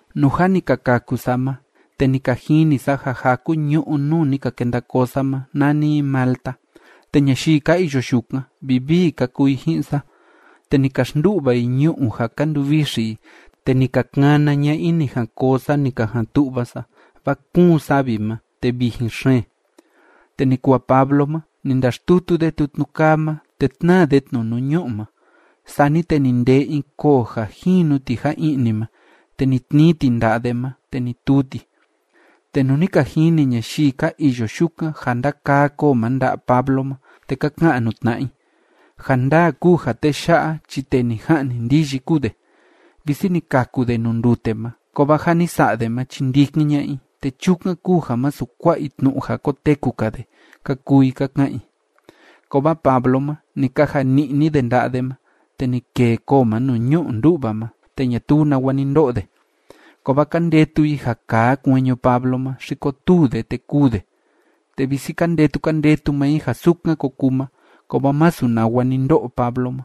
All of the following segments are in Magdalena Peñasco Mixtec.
Nuu jâ ni ka kaku sa ma, te ni ka jini sa ja jaku ñu'ú nuu ni ka kenda koo sa ma, nani i Malta. Te ñayii ka iyo yukan, vivii ka kuu i ji'in sa, te ni ka xndu'va i ñu'u ja ka nduvixi i, te ni ka kana ña'a i ni jan koo sa ni ka jan tu'va sa, vaa kuun savi ma, te vijin xeen. Te ni kuu ja Pablo ma, ni ndaxtutu de tutnu kaa ma, te tnáa de tnu nuu ñu'u ma. Sani te ni ndee in koo ja jinu ti ja i'ni ma, te ni tnii ti nda'a de ma, te ni tuu ti. Te nuu ni ka jini ñayii ka iyo yukan ja ndakaa koo ma nda'a Pablo ma, te ka ka'an nuu tna'a i: ―Ja ndaa kúu ja tee ya'a chi tee ni ja'ni ndiyi kúu de. Visi ni kaku de nuu ndute ma, kovaa ja ni sa'a de ma chi ndikin ña'a i, te chukan kúu ja masu kua'a i tnu'u ja koteku‑ka de ―ka kuu i ka ka'an i. Kovaa Pablo ma, ni kaja ni'ni de nda'a de ma, te ni kêe koo ma nuu ñu'u ndú'va ma, te ñatuu nawa ni ndo'o de. Kovaa ka ndetu i ja kaa kueñu Pablo ma, xi kotuu de te kûu de, te visi ka ndetu ka ndetu maa i ja sukan ko kuu ma, kovaa masu nawa ni ndo'o Pablo ma.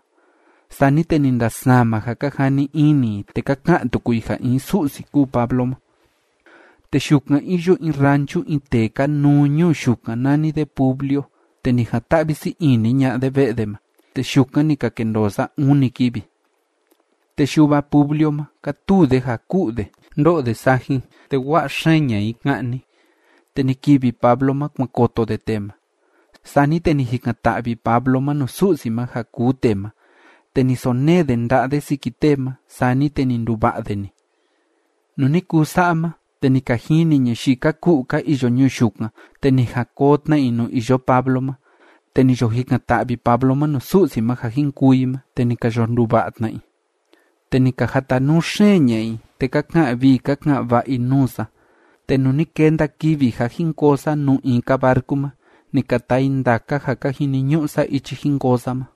Sani te ni ndasama ja ka jani ini i, te ka ka'an tuku i ja in su'si kúu Pablo ma. Te yukan iyo in ranchu in tee kanuu ñuu yukan nani de Publio, te ni jan‑ta'vi sii ini ña'a de ve'e de ma, te yukan ni ka kendoo sa uni kivi. Te yuva Publio ma, kátuu de ja ku'u de, ndó'o de sajin, te wa'a xeen ña'a in ka'ni. Te ni kivi Pablo ma, kuan koto de tee ma. Sani te ni jikan‑ta'vi Pablo ma nuu Su'si ma ja kuu tee ma, te ni sonee de nda'a de siki tee ma, sani te ni nduva'a de‑ni. Nuu ni kuu sa'a ma, te ni ka jini ñayii ka ku'u ka iyo ñuu yukan, te ni jan koo tna i nuu iyo Pablo ma, te ni yo jikan‑ta'vi Pablo ma nuu Su'si ma ja jin kuu i ma, te ni ka yo nduva'a tna i. Te ni ka jatanuu xeen ña'a i, te ka ka'an vii ka ka'an va'a i nuu sa, te nuu ni kenda kivi ja jin koo sa nuu in‑ka barcu ma, ni ka taa i ndaka ja ka jiniñu'u sa ichi jin koo sa ma.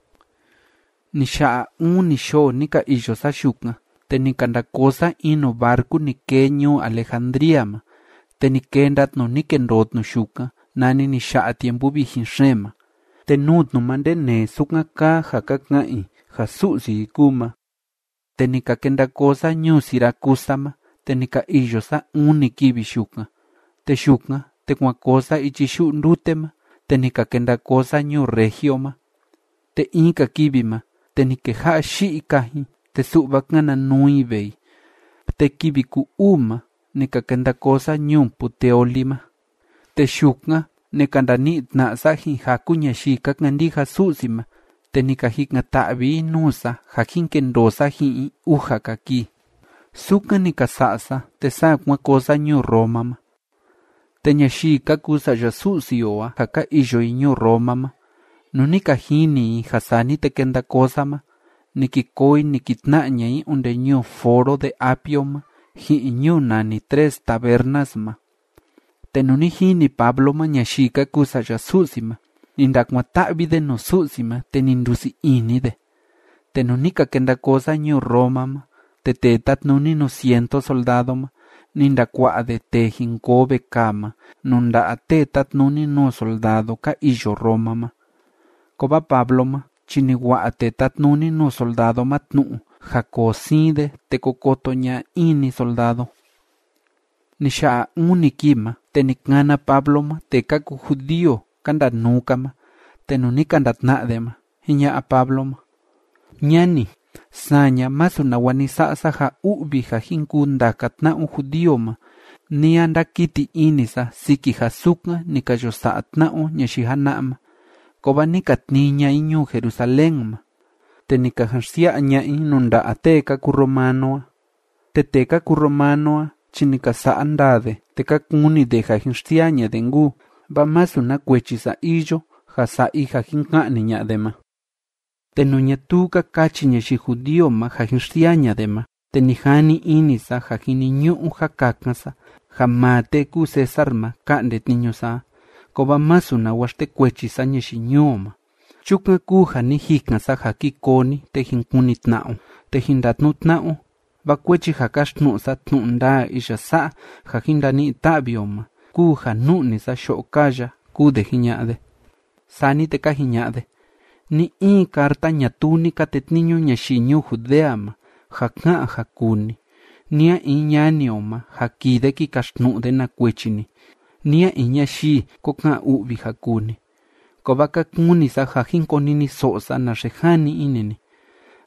Ni ya'a uni yoo ni ka iyo sa yukan, te ni ka nda koo sa in nuu barcu ni kee ñuu Alejandría ma, te ni kenda tnu ni kendoo tnu yukan nani ni ya'a tiempu vijin xeen ma, te nuu tnu ma ndenee sukan kaa ja ka ka'an i ja su'si i kúu ma. Te ni ka kenda koo sa ñuu Siracusa ma, te ni ka iyo sa uni kivi yukan. Te yukan, te kuan koo sa ichi yu'u ndute ma, te ni ka kenda koo sa ñuu Regio ma. Te in‑ka kivi ma, te ni keja'a yi'i kajin, te su'va kana nuu i vee i, te kivi ku‑uu ma ni ka kenda koo sa ñuu Puteoli ma. Te yukan ni ka ndani'i tna'a sa ji'in jaku ñayii ka kandija Su'si ma, te ni ka jikan‑ta'vi i nuu sa ja jin kendoo sa ji'in i uja‑ka kii. Sukan ni ka sa'a sa, te saa kuan koo sa ñuu Roma ma. Te ñayii ka kuu sa'ya Su'si o a ja ka iyo i ñuu Roma ma, nuu ni ka jini i ja sani te kenda koo sa ma, ni ki koo i ni ki tna'a ña'a i onde ñuu Foro de Apio ma ji'in ñuu nani Tres Tabernas ma. Te nuu ni jini Pablo ma ñayii ka kuu sa'ya Su'si ma, ni ndakuan‑ta'vi de nuu Su'si ma, te ni ndusii ini de. Te nuu ni ka kenda koo sa ñuu Roma ma, te tee tátnuni nuu cientu soldado ma, ni ndakua'a de tee jin koo vekaa ma nuu nda'a tee tátnuni nuu soldado ka iyo Roma ma. Kovaa Pablo ma chi ni wa'a tee tátnuni nuu soldado ma tnu'u ja koo siin de te ko koto ña'a in‑ni soldado. Ni ya'a uni kii ma, te ni kana Pablo ma tee ka kuu judío ka ndanuu‑ka ma, te nuu ni ka ndatna'a de ma, jiña'a Pablo ma: ―Ñani, saña, masu nawa ni sa'a sa ja u'vi ja jin kuu ndaka tna'a o judío ma, ni a ndakiti ini sa siki ja sukan ni ka yo sa'a tna'a o ñayii jana'a ma. Kovaa ni ka tnii ña'a i ñuu Jerusalén ma, te ni ka jan xsia'a ña'a i nuu nda'a tee ka kuu romano a. Te tee ka kuu romano a chi ni ka sa'a ndaa de, te ka kuni de ja jin xsiaa ña'a de nkuu, vaa masu na kuechi sa iyo ja sa'a i ja jin ka'ni ña'a de ma. Te nuu ñatuu ka kachi ñayii judío ma ja jin xsiaa ña'a de ma, te ni jani ini sa ja jiniñu'u ja kakan sa ja maa tee kúu César ma ka'nde tniñu sa a. Kovaa masu nawa xtekuechi sa ñayii ñuu o ma. Chukan kúu ja ni jikan sa ja ki koo ni, te jin kuni tna'a o, te jin ndatnu'u tna'a o, vaa kuechi ja káxtnu'u sa tnu'u ndaa iya sa'a ja jin ndani'i ta'vi o ma kúu ja nu'ni sa yo'o kaa ya ―kúu de jiña'a de. Sani te ka jiña'a de: ―Ni‑in carta ñatuu ni ka tetniñu ñayii ñuu Judea ma ja ká'an ja kuu ni, ni a in ñani o ma ja kii de ki kaxtnu'u de na kuechi ni, ni a in ñayii ko ka'an u'vi ja kuu ni. Kovaa ka kuni sa ja jin koniniso'o sa naxe jani ini ni,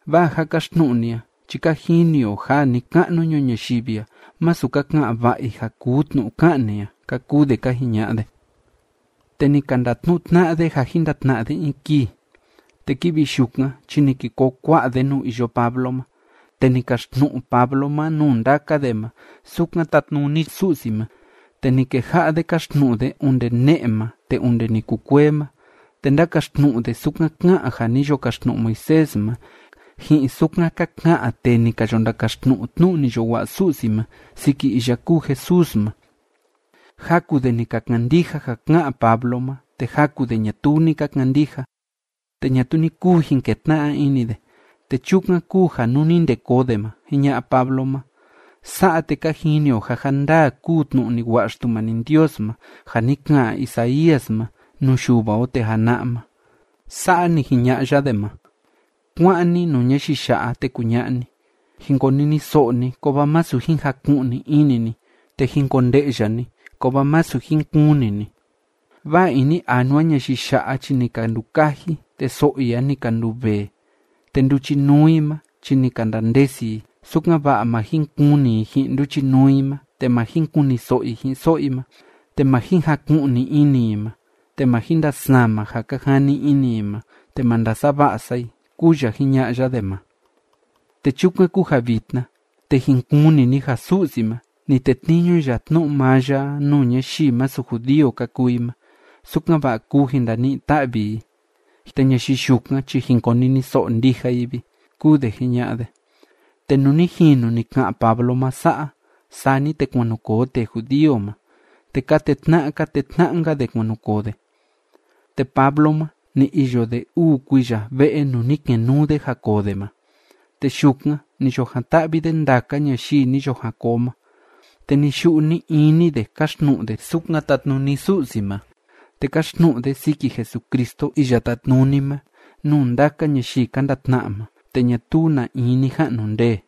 vaa ja káxtnu'u ni a chi ka jini o ja ni‑ka'nu ñuu ñayivi a masu ka ka'an va'a i ja kuu tnu'u ká'an ni a ―ka kuu de ka jiña'a de. Te ni ka ndatnu'u tna'a de ja jin ndatna'a de in kii, te kivi yukan chi ni ki koo kua'a de nuu iyo Pablo ma, te ni kaxtnu'u Pablo ma nuu ndaka de ma sukan tatnuni Su'si ma, te ni keja'a de káxtnu'u de onde ne'e ma te onde ni kukuee ma, te ndákaxtnu'u de sukan ká'an ja ni yo kaxtnu'u Moisés ma, ji'in sukan ka ka'an tee ni ka yo ndakaxtnu'u tnu'u ni yo wa'a Su'si ma siki iya kúu Jesús ma. Jaku de ni ka kandija ja ká'an Pablo ma, te jaku de ñatuu ni ka kandija. Te ñatuu ni kuu jin ketna'a ini de, te chukan kúu ja nuu ni nde koo de ma, jiña'a Pablo ma: ―Sa'a, te ka jini o ja ja ndaa kúu tnu'u ni wa'a Xtumani Ndios ma ja ni ka'an Isaías ma nuu yuva o tee jana'a ma. Sa'a ni jiña'a ya de ma: Kuá'an ni nuu ñayii ya'a, te kuña'a ni: Jin koniniso'o ni, kovaa masu jin jaku'ni ini ni, te jin konde'ya ni, kovaa masu jin kuni ni. Vaa ini anua ñayii ya'a chi ni ka ndukaji, te so'o i a ni ka nduvee, te nduchinuu i ma chi ni ka ndandesi i, sukan‑va'a ma jin kuni i ji'in nduchinuu i ma, te ma jin kuniso'o i ji'in so'o i ma, te ma jin jaku'ni ini i ma, te ma jin ndasama ja ka jani ini i ma, te ma ndasava'a sa i, kúu ya jiña'a ya de ma. ’Te chukan kúu ja vitna, te jin kuni ni ja Su'si ma, ni tetniñu ya tnu'u maa ya a nuu ñayii masu judío ka kuu i ma, sukan‑va'a kuu jin ndani'i ta'vi i. Te ñayii yukan chi jin koniniso'o ndija i vi ―kúu de jiña'a de. Te nuu ni jinu ni ka'an Pablo ma sa'a, sani te kuan nu koo tee judío ma, te ka tetna'a ka tetna'a‑nka de kuan nu koo de. Te Pablo ma, ni iyo de uu kuiya ve'e nuu ni kenuu de ja koo de ma, te yukan ni yo jan‑ta'vi de ndaka ñayii ni yo jan koo ma. Te ni‑yu'u ni‑ini de káxtnu'u de sukan tatnuni Su'si ma, te káxtnu'u de siki Jesucristo Iya Tátnuni ma nuu ndaka ñayii ka ndatna'a ma, te ñatuu na in ni ja'nu ndee.